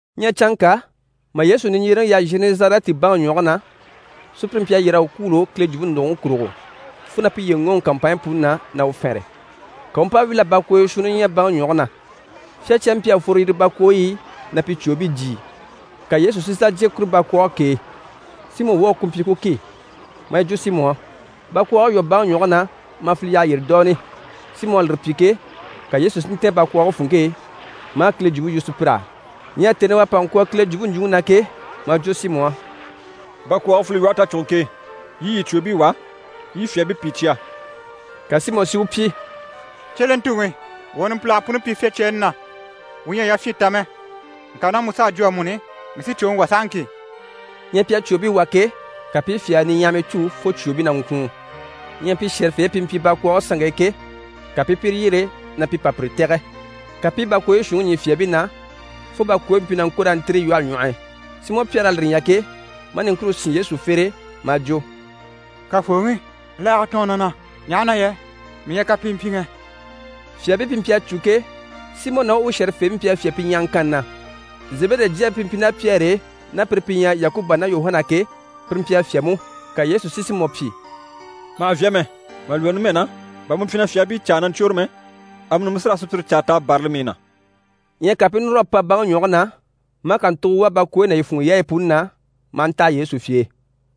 Ɲyɛ canŋka mà Yesu niɲjyereŋi yaha Zhenɛzarɛti baŋi ɲwɔge na, sùpyire mpyi a yyér'a u kwûulo Kile jwumpe ndògoŋi kurugo, fo na piye ŋɔɔŋi kàmpanɲyi puni na, na u fɛnre. Ka u u mpa wíl'a bakwooyo shuunni ɲya baŋi ɲwɔge na. Fyácyaabii mpyi a fworo yire bakwooyi i na pi cwòobii jyìi. Ka Yesu si sà jyè kuru bakwɔɔge k'e, Simɔ woge ku mpyi ku ki, maa yi jwo Simɔ á: «Bakwɔɔge lwɔ́ baŋi ɲwɔge na mà file yyaha yyére dooni.» Simɔ à lire pyi ke, ka Yesu si ntɛ̀ɛn bakwɔɔge funŋke e, maa Kile jwumpe yu sùpyir'á. Ɲyɛ tèni i u à pa ŋkwɔ̀ Kile jwumpe ɲjwuŋi na ke, maa jwo Simɔ á: «Bakwɔɔge file lwɔhe tacuguŋke e, yii i yii cwòobii wà, yii i fyaabii pìi cya.» Ka Simɔ si u pyi: «Cyelentuŋi, wuu à numpilage puni pyi fyácyaani na, wuu ɲyɛ a yafyin ta mɛ, ŋka ná mu s'à jwo amuni, mii sí cwòŋi wà sahaŋki.» Ɲyɛ pi à cwòobii wà ke, ka pi i fyaa niɲyahamii cû fo cwòobii na ŋkwùun. Ɲyɛ pi shɛ̀rɛfeebii pi mpyi bakwɔɔge sanŋke e ke, ka pi i pire yyere na pi pa pire tɛ̀gɛ. Ka pi i bakwooyi shuunniŋi ɲî fyaabii na, fo bakwooyi mpyi na ŋko raa ntîri lwɔhe ɲwɔh'i. Simɔ Pyɛri à lire ɲya ke, maa niŋkure sín Yesu fere e, maa jwo: «Kafooŋi, laaga tɔɔn na na, ɲaha na yɛ mii ɲyɛ kapimpyiŋɛ.» Fyaabii pi mpyi a cû ke, Simɔ ná u shɛ̀rɛfeebii mpyi a fyá pi ɲyahaŋkanni na. Zebede jyaabii pi mpyi ná Pyɛri e, ná pire pi ɲyɛ Yakuba ná Yuhana ke, pire mpyi a fyá mú. Ka Yesu si Simɔ pyi: «Ma hà vyá mɛ. Mà lwɔ́ numɛ na, bà mu mpyi na fyaabii caa na ɲcwôre mɛ, amuni mu sí raa sùpyire caa t'a bârali mii na.» Ɲyɛ ka pi i núr'a pa baŋi ɲwɔge na, maa kàntugo wà bakwooyi ná yi funŋɔ yaayi puni na, maa ntaha Yesu fye e.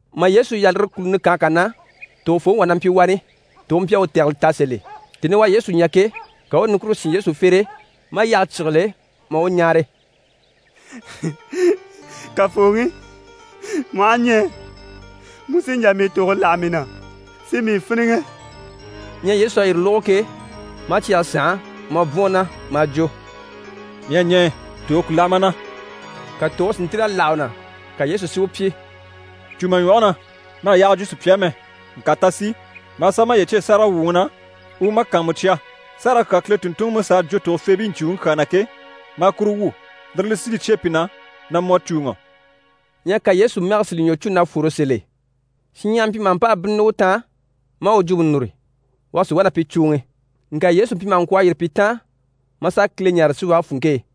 Mà Yesu yaha lire kùluni kànhe kà na, tògofooŋi wà na mpyi wani, tòge mpyi a u tɛgɛlɛ ta sèl'e. Tèni i u à Yesu ɲya ke, ka u u niŋkure sín u fere e, maa yyahe cyígile, maa u ɲáare: «Kafooŋi, mu aha ɲɛɛ, mu sí n‑jà mii tòge láha mii na si mii fíniŋɛ.» Ɲyɛ Yesu à yire lógo ke, maa cyɛge sànha maa bwɔ̀n u na, maa jwo: «Mii à ɲɛɛ, tòge ku láha ma na!» Ka tòge si ntíl'a láha u na. Ka Yesu si u pyi: «Cû ma ɲwɔge na, ma hà yaaga jwo sùpya á mɛ. Ŋka ta sì, maa sà maye cyêe sáragawwuŋi na u u ma kàanmucya, sárage kyaa Kile tùnntunŋiMusa à jwo tògofeebii ɲcùuŋɔŋi kyaa na ke, maa kuru wwû. Lire li sí li cyêe pi na na mu à cùuŋɔ.» Ɲyɛ ka Yesu mɛge si li ɲwɔ cû na fwore sèl'e. Shinɲyahara mpyi maha mpa a bínnini u taan, maa u jwumpe núru, u a sì wá na pi cùuŋi. Ŋka Yesu mpyi maha ŋkwɔ̀ a yîri pi taan, maa sà Kile ɲáare síwage funŋke e.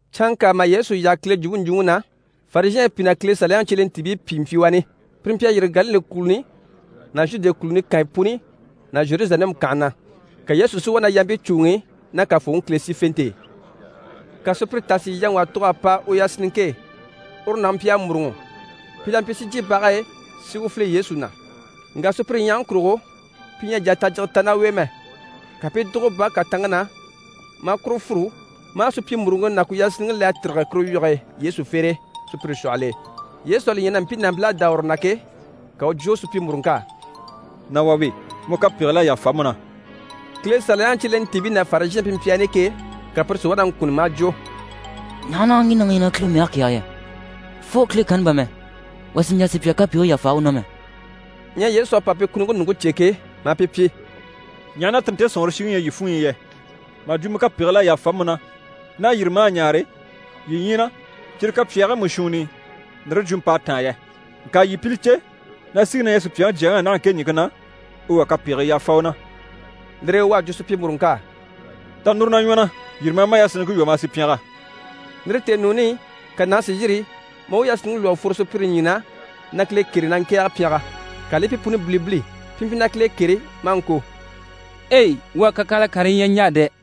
Canŋka mà Yesu yaha Kile jwumpe ɲjwuŋi na, Farizhɛɛnbii pìi ná Kile Saliyaŋi cyelentiibii pìi mpyi wani. Pire mpyi a yîri Galile kùluni ná Zhude kùluni kànyi puni ná Zheruzalɛmu kànhe na. Ka Yesu si wá na yampii cùuŋi ná Kafooŋi Kile sífente e. Ka sùpyire tà si yaŋi wà tug'a pa u yasinniŋke e, uru nàŋi mpyi a mûruŋɔ. Pi la mpyi si jyè bage e si u file Yesu na. Ŋka sùpyire ɲyahaŋi kurugo, pi ɲyɛ a jà a tajyige ta ná u e mɛ; ka pi i dùgo bage kàtanŋke na, maa kuru fûru, maa supyimuruŋke ná ku yasinniŋke le a tîrige kuru wyige e Yesu fere e sùpyire shwɔhɔl'e. Yesu à li ɲya na mpii nàmpil'à dá uru na ke, ka u u jwo supyimuruŋk'á: «Nà wà we, mu kapegigil'à yàfa mu na.» Kile Saliyaŋi cyelentiibii ná Farizhɛɛnbii pi mpyi wani ke, ka pire si wá na ŋkunni maa jwo: «Ɲaha na ŋge nàŋi ɲyɛ na Kile mɛge kɛ̀ɛge yɛ? Fo Kile kanni bà mɛ, wà sì n‑jà sùpya kapegigii yàfa u na mɛ!» Ɲyɛ Yesu à pa pi kunuŋke ɲùŋke cè ke, maa pi pyi: «Ɲaha na tire nte sɔ̀nŋɔre shiŋi ɲyɛ yii funɲyi i yɛ? Mà jwo “Mu kapegigil'à yàfa mu na” ná “Yîri, maa ɲaare” yii ɲyii na, cyire kapyaagii mú shuunni i ndire jwumɔ p'à táan yɛ? Ŋka yii pi li cè na síŋi na ɲyɛ Supyaŋi Jyaŋi á naha ɲìŋke na, u wà kapegii yàfa u na.» Lire e u à jwo supyimuruŋk'á: «Ta núru na ɲwɔ na. Yîri maa ma yasinniŋke lwɔ́ maa sì pyɛngɛ.» Lire tèenuuni i, ka nàŋi si yîri maa u yasinniŋke lwɔ́ a fworo sùpyire ɲyii na, na Kile kêre, na ŋkɛ̀ɛge pyɛngɛ. Ka li i pi puni bilibili. Pi mpyi na Kile kêre, maa ŋko: «Ei! Wuu à kakyanhala karii ɲya niɲjaa dɛ!»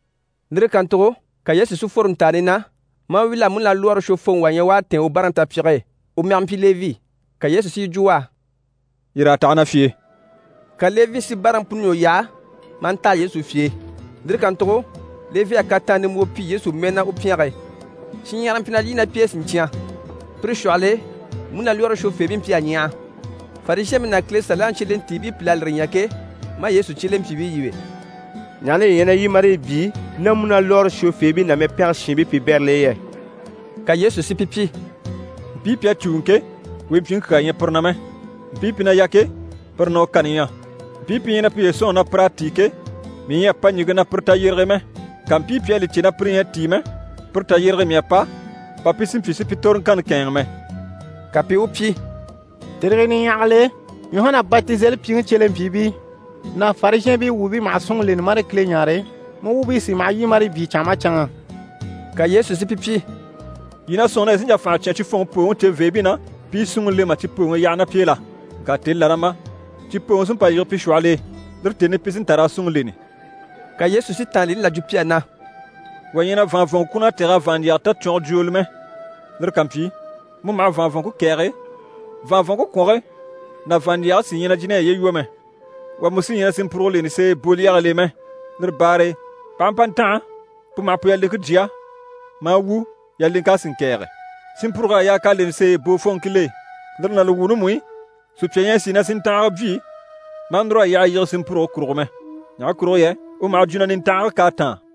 Lire kàntugo ka Yesu si fworo ntàani na, maa wíl'a múnalwɔɔre shwofooŋi wà ɲya u à tɛ̀ɛn u báaraŋi tapyige e. U mɛge mpyi Levi. Ka Yesu si yi jwo u á: «Yîr'a taha na fye e.» Ka Levi si báaraŋi puni ɲwɔ yaha maa ntaha Yesu fye e. Lire kàntugo Levi à kataan nimbwoo pyi Yesu mɛɛ na u pyɛnge e. Shinɲyahara mpyi na lyî ná pi e siɲcyan. Pire shwɔhɔl'e, múnalwɔɔre shwofeebii mpyi a ɲyaha. Farizhɛɛnbii ná Kile Saliyaŋi cyelentiibii pìl'à lire ɲya ke, maa Yesu cyelempyiibii yíbe: «Ɲaha na yii ɲyɛ na lyî marii byii ná múnalwɔɔre shwofeebii ná mɛpɛngɛ shiinbii piibɛril'e yɛ?» Ka Yesu si pi pyi: «Mpii pi à cùuŋɔ ke, wempyiŋi kyaa ɲyɛ pire na mɛ, mpii pi na yà ke, pire na u kani ɲyɛ. Mpii pi ɲyɛ na piye sɔ̂nŋi na pir'à tíi ke, mii ɲyɛ a pa ɲìŋke na pire tayyerege e mɛ. Ŋka mpii pi à li cè na pire ɲyɛ a tíi mɛ, pire tayyerege e mii à pa, bà pi si mpyi si pi toroŋkanni kɛ̂ɛnŋɛ mɛ.» Ka pi i u pyi: «Tèrii niɲyahagil'e Yuhana Batizelipyiŋi cyelempyiibii ná Farizhɛɛnbii wuubii maha súnŋi leni marii Kile ɲáare, mu wuubii sí maha lyî marii byii canŋa maha canŋa.» Ka Yesu si pi pyi: «Yii na sɔ̂nŋi na yii sí n‑jà fànha cyán cifɔnŋi pooŋi ceveebii na, pi i súnŋi le mà cipooŋi yaha ná pi e la? Ŋka tèni là na ma, cipooŋi sí n‑pa n-yige pi shwɔhɔl'e. Lire tèni i pi sí n‑ta raa súnŋi leni.» Ka Yesu si tàanlini là jwo pi á na: «Wà ɲyɛ na vàanvɔnŋɔ kwùnn'a tɛ̀g'a vàanɲjyɛga tacwɔngɔ jwooli mɛ. Lire ká mpyi, mu maha vàanvɔnŋke kɛ̀ɛge, vàanvɔnŋke kwɔnge ná vàanɲjyɛge sí ɲyɛ na jìn'a yiye lwɔ́ mɛ. Wà mú sí ɲyɛ na sinmpurugo leni seeye boolyɛgil'e mɛ. Lire baare e p'aha mpa ntanha, pu maha pu yaleŋke jya, maa wu, yaleŋk'a sì ŋkɛ̀ɛge. Sinmpurug'à yaa k'a leni seeyi boofɔnŋkil'e. Lire ná li wuuni mú i, sùpya ɲyɛ a sìi na sinntanhaga byii maa núr'a yyaha yige sinmpurugo kurugo mɛ. Ɲaha kurugo yɛ u maha jwo na nintanhage k'à táan.»